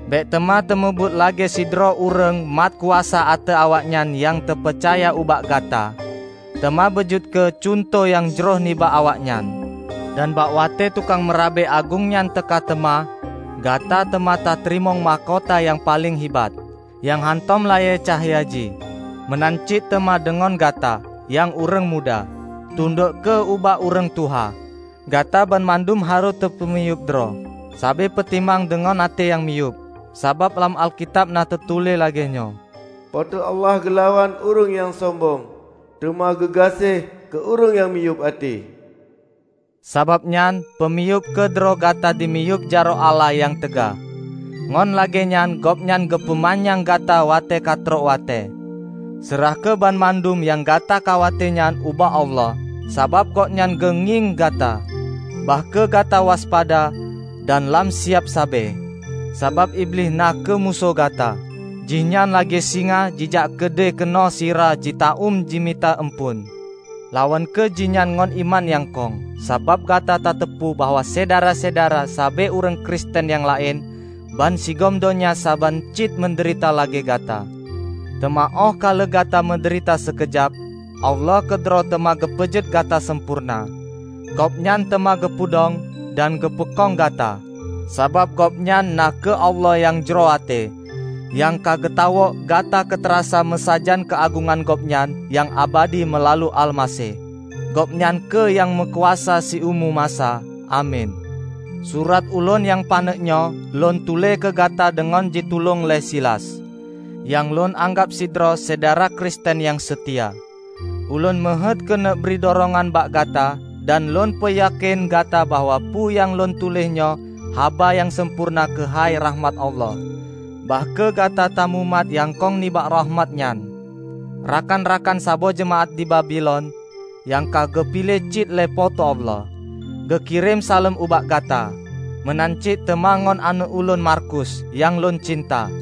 Bék teuma tameubuet lagée sidroe ureuëng mat kuasa ateueh awaknyan nyang teupeucaya ubak gata, teuma beujeuet kheueh cuntoh nyang jroh nibak awaknyan. Dan bak watée tukang Meurabe Agong nyan teuka teuma, gata teuma tateurimong mahkota nyang paleng hibat, nyang hántom layée cahya jih. Meunan cit teuma deungon Gata, nyang ureuëng muda. Tundok kheueh ubak ureuëng tuha. Gata banmandum harôh tapeumiyueb droe sabe peutimang deungon até nyang miyueb. Sabab lam Alkitab na teutuléh lagée nyoe, "Po teu Allah geulawan ureuëng nyang sombong, teuma geugaséh keu ureuëng nyang miyueb até." Sabab nyan, peumiyueb kheueh droe gata dimiyueb jaroe Allah nyang teuga, ngon lagée nyan Gobnyan geupeumanyang gata watée katrok watée. Seurah kheueh banmandum nyang gata khawate nyan ubak Allah, sabab Gobnyan geungieng gata. Bah kheueh gata waspada dan lam siab sabe! Sabab Iblih na kheueh musoh gata. Jihnyan lagée singa jijak keudeh keunoe sira jitaúm jimita eumpeuen. Lawan kheueh jihnyan ngon iman nyang kong, sabab gata tateupeue bahwa syedara-syedara sabe ureuëng Kristen nyang laén bansigom donya saban cit meudeurita lagée gata. Teuma óh ka lheueh gata meudeurita sikeujab, Allah keudroe teuma geupeujeuet gata sampoereuna. Gobnyan teuma geupeudong dan geupeukong gata. Sabab Gobnyan na kheueh Allah nyang jroh até, nyang ka geutawök gata keutarasa meusajan keuagongan Gobnyan nyang abadi meulalu Almaseh. Gobnyan kheueh nyang meukuasa siumu masa! Amin. Surat ulôn nyang paneuk nyoe lôn tuléh keugata deungon jitulông lé Silas, nyang lôn anggab sidroe syedara Kristen nyang seutia. Ulôn meuheuét keuneuk bri durongan bak gata dan lôn peuyakén gata bahwa peue nyang lôn tuléh nyoe haba nyang sampoereuna keuhai rakhmat Allah. Bah kheueh gata tamumat nyang kong nibak rakhmat nyan. Rakan-rakan saboh jeumaáh di Babilon, nyang ka geupiléh cit lé Po teu Allah, geukirém saleuem ubak gata; meunan cit teuma ngon aneuëk ulôn Markus nyang lôn cinta.